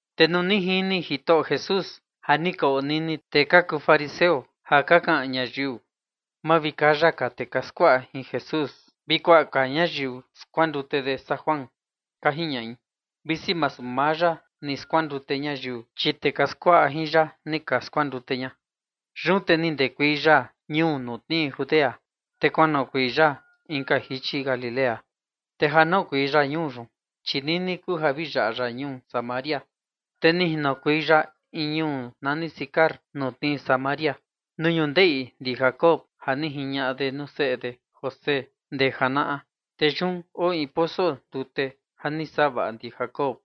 Te nuu ni jini Jitoꞌo Jesús ja ni ka onini tee ka kuu fariseo ja ka kaꞌan ñayiu: “Mavikaya ka tee ka skuaꞌa jin Jesús vi kuaꞌa ka ñayiu skuandute de saa Juan”, ka jiñaꞌi, visi masu maa ya ni skuandute ñayiu, chi tee ka skuaꞌa jin ya ni ka skuandute ña. Yun te ni ndekuei ya ñuu ja tnii Judea, te kuanoꞌokuei ya inka jichi Galilea. Te ja noꞌokuei ya ñuu yun, chi nini kuu ja vi yaꞌa ya ñuu Samaria. Te ni jinokuei ya in ñuu nani Sicar, ja tnii Samaria, nuu ñundeꞌi ndi Jacob ja ni jiñaꞌa de nuu seꞌe de José ndee janaꞌa. Te yun oo in poso ndute ja ni savaꞌa ndi Jacob.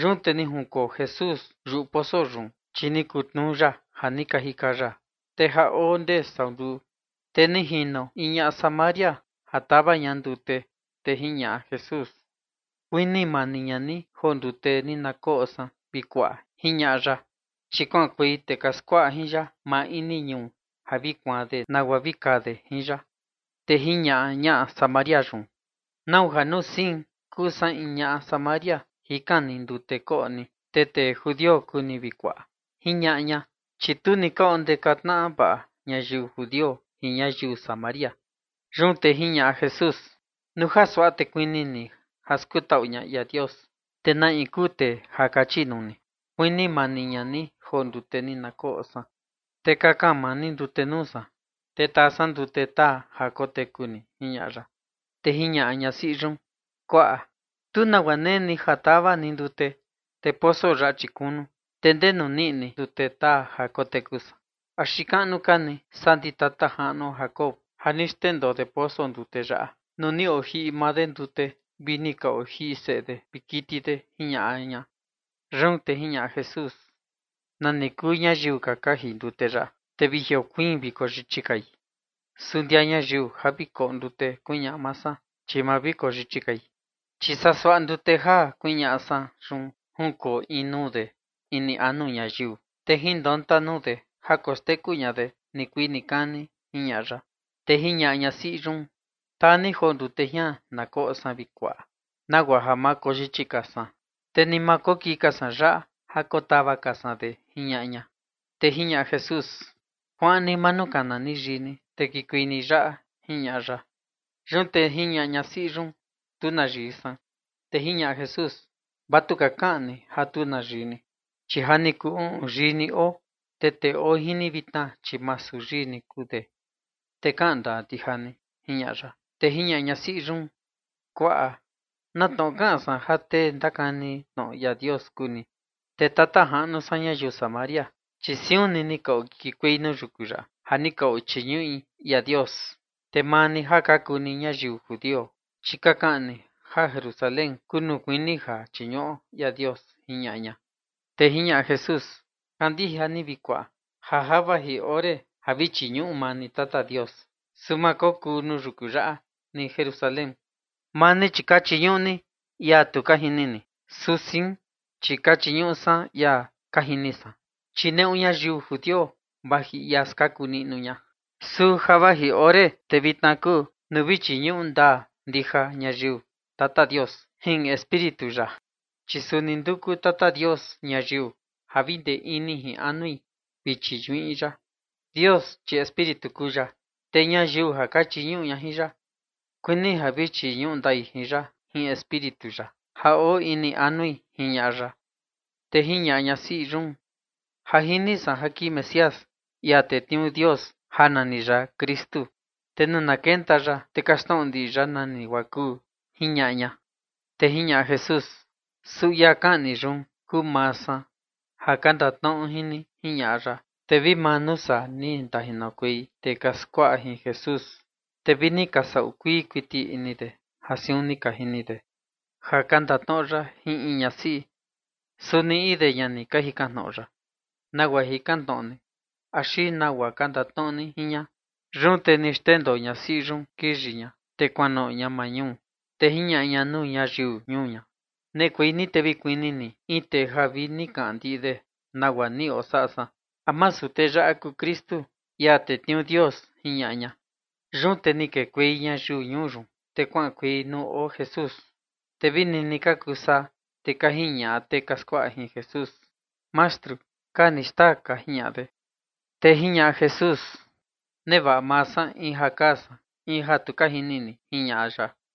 Yun te ni junkoo Jesús yuꞌu poso yun, chi ni kutnuu ya ja ni ka jika ya. Te ja oo ndee sau nduu. Te ni jino in ñaꞌa Samaria ja tau ña ndute, te jiñaꞌa Jesús: ―Kuni mani ña ni joo ndute ni na koꞌo san, vi kuaꞌa ―jiñaꞌa ya. Chi kuaꞌankuei tee ka skuaꞌa jin ya maa ini ñuu ja vi kuaan de nagua vi kaa de jin ya. Te jiñaꞌa ñaꞌa Samaria yun: ―¿Nau ja saa nuu sein ja kuu san in ñaꞌa Samaria jikan ni ndute koꞌo ni, te tee judio kuu ni, vi kuaꞌa? ―jiñaꞌa ña, chi tu ni ka ondeka tnaꞌa vaꞌa ñayiu judio jin ñayiu Samaria. Yun te jiñaꞌa Jesús: ―Nuu ja suaꞌa te kuni ni ja skutaꞌu ña ia Dios, te na in kuu tee ja kachi nuu ni: “Kuni mani ña ni joo ndute ni na koꞌo san”, te kakan maa ni ndute nuu san, te taa san ndute taa ja koteku ni ―jiñaꞌa ya. Te jiñaꞌa ñasiꞌi yun: ―Kuaꞌa, tu nagua nee ni ja tau ni ndute, te poso yaꞌa, chi kunu, ¿te ndenu niꞌi ni ndute taa ja koteku san? ¿Axi kaꞌnu ka ni saa ndi tata jaꞌnuo Jacob, ja ni xndendoo de poso ndute yaꞌa nuu ni ojiꞌi maa de ndute vi ni ka ojiꞌi seꞌe de vi kiti de? ―jiñaꞌa ña. Yun te jiñaꞌa Jesús: ―Nani kuu ñayiu ja ka jiꞌi ndute yaꞌa, te vi jiokuiin vi koyichi kai. Su ndia ñayiu vi koꞌo ndute ja kuñaꞌa maa san, chi ma vi koyichi kai, chi saa suaꞌa ndute ja kuñaꞌa san yun junkoo in nuu kaꞌnu de ini anu ñayiu, te jinonta nuu de ja koxteku ña de nikuii nikani ―jiñaꞌa ya. Te jiñaꞌa ñasiꞌi yun: ―Taa ni joo ndute jian na koꞌo san, vi kuaꞌa, nagua ja ma koyichi ka san, te ni ma kokii ka san yaꞌa ja kotau ka san de ―jiñaꞌa ña. Te jiñaꞌa Jesús: ―Kuaꞌan ni manukana ni yii ni, te kikuei ni yaꞌa ―jiñaꞌa ya. Yun te jiñaꞌa ñasiꞌi yun: ―Tu na yii san. Te jiñaꞌa Jesús: ―Vatuka kaꞌan ni ja tu na yii ni, chi ja ni kuu uꞌun yii ni oo, te tee oo jin ni vitna, chi masu yii ni kuu de, te kaꞌan ndaa ndija ni ―jiñaꞌa ya. Te jiñaꞌa ñasiꞌi yun: ―Kuaꞌa, na tnoꞌo kaꞌan san ja tee ndakani tnoꞌo ia Dios kuu ni. Te tata jaꞌnu san, ñayiu Samaria, chi siun ni ni okikuei nuu yuku yaꞌa ja ni ka ochiñuꞌi ia Dios, te maa ni ja ka kuu ni ñayiu judio, chi ka kaꞌan ni ja Jerusalén kuu nuu kuini ja chiñuꞌo ia Dios ―jiñaꞌa ña. Te jiñaꞌa Jesús: ―Kandija ni, vi kuaꞌa, ja ja vaji ore ja vi chiñuꞌu maa ni Tata Dios, su ma kokuu nuu yuku yaꞌa ni Jerusalén. Maa ni, chi ka chiñuꞌu ni ia tu ka jini ni. Su sein, chi ka chiñuꞌu san ia ka jini san, chi neꞌu ñayiu judio vaji ia skaku niꞌnu ña. Su ja vaji ore te vitna kuu nuu vi chiñuꞌu ndaa ndija ñayiu Tata Dios jin Espíritu ya, chi suni nduku Tata Dios ñayiu ja vi ndee ini ndee anui vi chiñuꞌi ya. Dios, chi Espíritu kuu ya, te ñayiu ja ka chiñuꞌu ya kuini ja vi chiñuꞌu ndai ya jin Espíritu ya ja oo ini anui ―jiñaꞌa ya. Te jiñaꞌa ñasiꞌi yun: ―Ja jini san ja kii Mesías, ia tetniuu Dios, ja nani ya Kristu. Te nuu na kenta ya, te kaxtnoꞌo ndiꞌi ya nani guaa kuu ―jiñaꞌa ña. Te jiñaꞌa Jesús: ―Su ia kaꞌan ni yun kuu maa san ja ka ndatnoꞌo jin ni ―jiñaꞌa ya. Te vi maa nuu saa ni ndajinokuei tee ka skuaꞌa jin Jesús, te vi ni ka saꞌu kuii kuiti ini de ja siun ni ka jini de ka ndatnoꞌo ya jin in ñasiꞌi, su ni in de ña ni ka jikan tnoꞌo ya: “¿Nagua jikan tnoꞌo ni?”, axi “¿nagua ka ndatnoꞌo ni jin ña?” Yun te ni xndendoo ñasiꞌi yun kiyi ña, te kuanoꞌo ña maa ñuu, te jiñaꞌa ña nuu ñayiu ñuu ña: ―Neꞌekuei ni te vi kuni ni in tee ja vi ni kaꞌan ndiꞌi de nagua ni osaꞌa san. ¿A masu tee yaꞌa kuu Kristu, ia tetniuu Dios? ―jiñaꞌa ña. Yun te ni kekuei ñayiu ñuu yun, te kuaꞌankuei nuu oo Jesús. Te vi nini ka kuu saa, te ka jiñaꞌa tee ka skuaꞌa jin Jesús: ―Mastru, kaa ni xtaa ―ka jiñaꞌa de. Te jiñaꞌa Jesús: ―Nevaꞌa maa san in ja kaa san, in ja tu ka jini ni ―jiñaꞌa ya.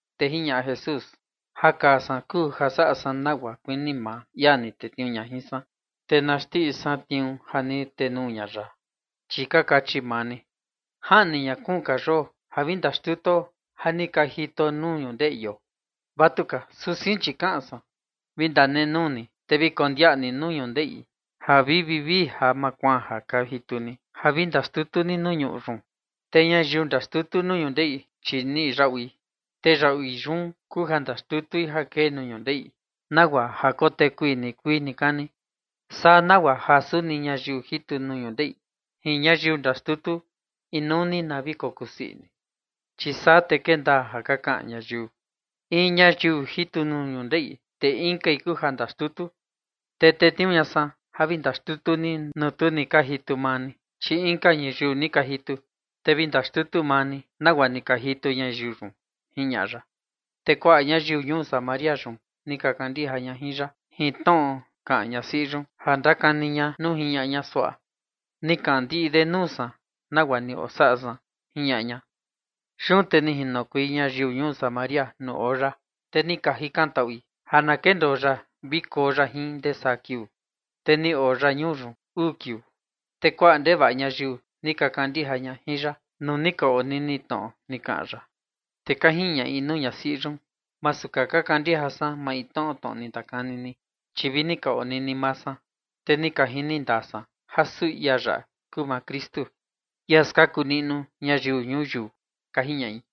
Te jiñaꞌa Jesús: ―Ja kaa san kuu ja saꞌa san nagua kuini maa ia ni tetniuu ña jin san, te na xndiꞌi san tniuu ja ni tenuu ña ya. Chi ka kachi maa ni: “Jaꞌni ña kuun ka yoo ja vi ndaxtutuo ja ni ka jituo nuu ñundeꞌio”. Vatuka, su sein, chi kaꞌan san: “Vi ndanenuu ni te vi kondiaꞌa ni nuu ñundeꞌi ja vi vivii ja makuaan ja ka jitu ni ja vi ndaxtutu ni nuu ñuꞌu yun”. Te ñayiu ndaxtutu nuu ñundeꞌi, chi niꞌi yaꞌui, te yaꞌui yun kuu ja ndaxtutui ja kee nuu ñundeꞌi nagua ja kotekui nikuii nikani, saa nagua ja suni ñayiu jitu nuu ñundeꞌi jin ñayiu ndaxtutu, inuu ni na vi kokusii ini. Chi saa te kee ndaa ja ka kaꞌan ñayiu: “In ñayiu jitu nuu ñundeꞌi, te inkai kuu ja ndaxtutu”. Te tetniuu ña san ja vi ndaxtutu ni nuu tu ni ka jitu maa ni, chi inka ñayiu ni ka jitu, te vi ndaxtutu maa ni nagua ni ka jitu ñayiu yun ―jiñaꞌa ya. Te kuaꞌa ñayiu ñuu Samaria yun ni ka kandija ña jin ya, jin tnoꞌo kaꞌan ñasiꞌi yun ja ndakani ña nuu jiñaꞌa ña suaꞌa: “Ni kaꞌan ndiꞌi de nuu san nagua ni osaꞌa san”, jiñaꞌa ña. Yun te ni jinokuei ñayiu ñuu Samaria nuu oo ya, te ni ka jikantaꞌui ja na kendoo ya vi koo ya jin ndee saa kiuu, te ni oo ya ñuu yun uu kiuu. Te kuaꞌa ndevaꞌa ka ñayiu ni ka kandija ya nuu ni ka onini tnoꞌo ni kaꞌan ya. Te ka jiñaꞌi nuu ñasiꞌi yun: ―Masu ka kandija ka san maintnoꞌo tnoꞌo ni ndakani ni, chi vi ni ka onini maa san, te ni ka jini ndaa san ja suu ia yaꞌa kuu Kristu, ia skaku niꞌnu ñayiu ñuyiu ―ka jiñaꞌi.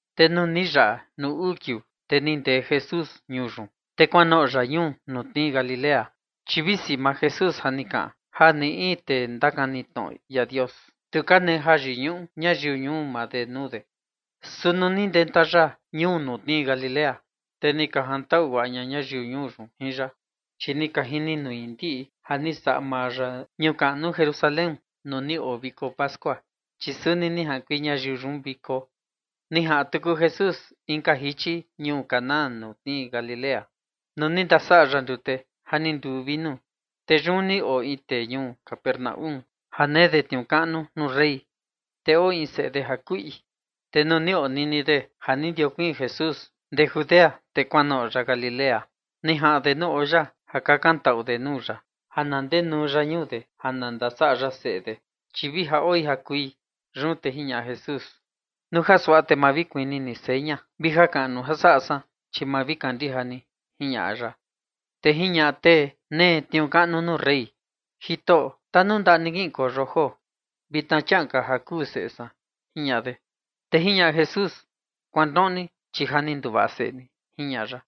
Te nuu ni yaꞌa nuu uu kiuu, te ni ndee Jesús ñuu yun, te kuanoꞌo ya ñuu ja tnii Galilea. Chi visi maa Jesús ja ni kaꞌan ja ni in tee ndakani tnoꞌo ia Dios, tu ka nee yiñuꞌu ñayiu ñuu maa de nuu de. Su nuu ni ndenta ya ñuu ja tnii Galilea, te ni ka jantaꞌu guaꞌa ña ñayiu ñuu yun jin ya, chi ja ni ka jini nui ndiꞌi ja ni saꞌa maa ya ñuu kaꞌnu Jerusalén nuu ni oo viko pascua, chi suni ni jaꞌankuei ñayiu yun nuu viko. Ni jaꞌan tuku Jesús inka jichi ñuu Caná ja tnii Galilea nuu ni ndasaꞌa ya ndute ja ni nduu vinu. Te yun ni oo in tee ñuu Capernaúm ja nee de tniuu kaꞌnu nuu rey, te oo in seꞌe de ja kuꞌi. Te nuu ni onini de ja ni ndajiokuiin Jesús ndee Judea, te kuanoꞌo ya Galilea, ni jaꞌan de nuu oo ya ja kakantaꞌu de nuu ya ja na ndenuu ya ñuu de ndasaꞌa ya seꞌe de, chi vi ja oi ja kui. Yun te jiñaꞌa Jesús: ―Nuu ja suaꞌa, te ma vi kuni ni seña vi jakaꞌnu saꞌa san, chi ma vi kandija ni ―jiñaꞌa ya. Te jiñaꞌa tee nee tniuu kaꞌnu nuu rey: ―Jitoꞌo, tanundaꞌa ni, kiꞌinkueio joo ama ka ja kuu seꞌe san ―jiñaꞌa de. Te jiñaꞌa Jesús: ―Kuanoꞌo ni, chi ja ni nduvaꞌa seꞌe ni ―jiñaꞌa ya.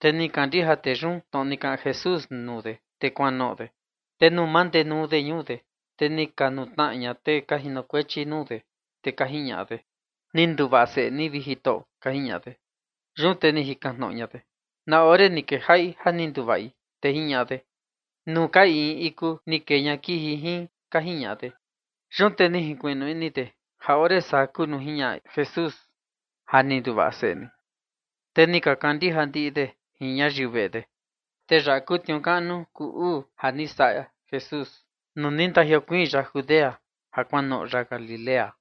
Te ni kandija tee yun tnoꞌo ni kaꞌan Jesús nuu de, te kuanoꞌo de. Te nuu mandenuu de ñuu de, te ni ka nutnaꞌa ña tee ka jinokuechi nuu de, te ka jiñaꞌa de: ―Ni nduvaꞌa seꞌe ni, vi Jitoꞌo ―ka jiñaꞌa de. Yun te ni jikan tnoꞌo ña de: ―¿Na ore ni kejaꞌi ja ni nduvaꞌi? Te ka jiñaꞌa de: ―Nuu ka in iku ni kee ña kiji jin ―ka jiñaꞌa de. Yun te ni jinkuiꞌnu ini de ja ore saa kuu nuu jiñaꞌa Jesús: “Ja ni nduvaꞌa seꞌe ni”, te ni ka kandija ndiꞌi de jin ñayiu veꞌe de. Te yaꞌa kuu tniuu kaꞌnu kuu uu ja ni saꞌa Jesús nuu ni ndajiokuiin ya Judea ja kuanoꞌo ya Galilea.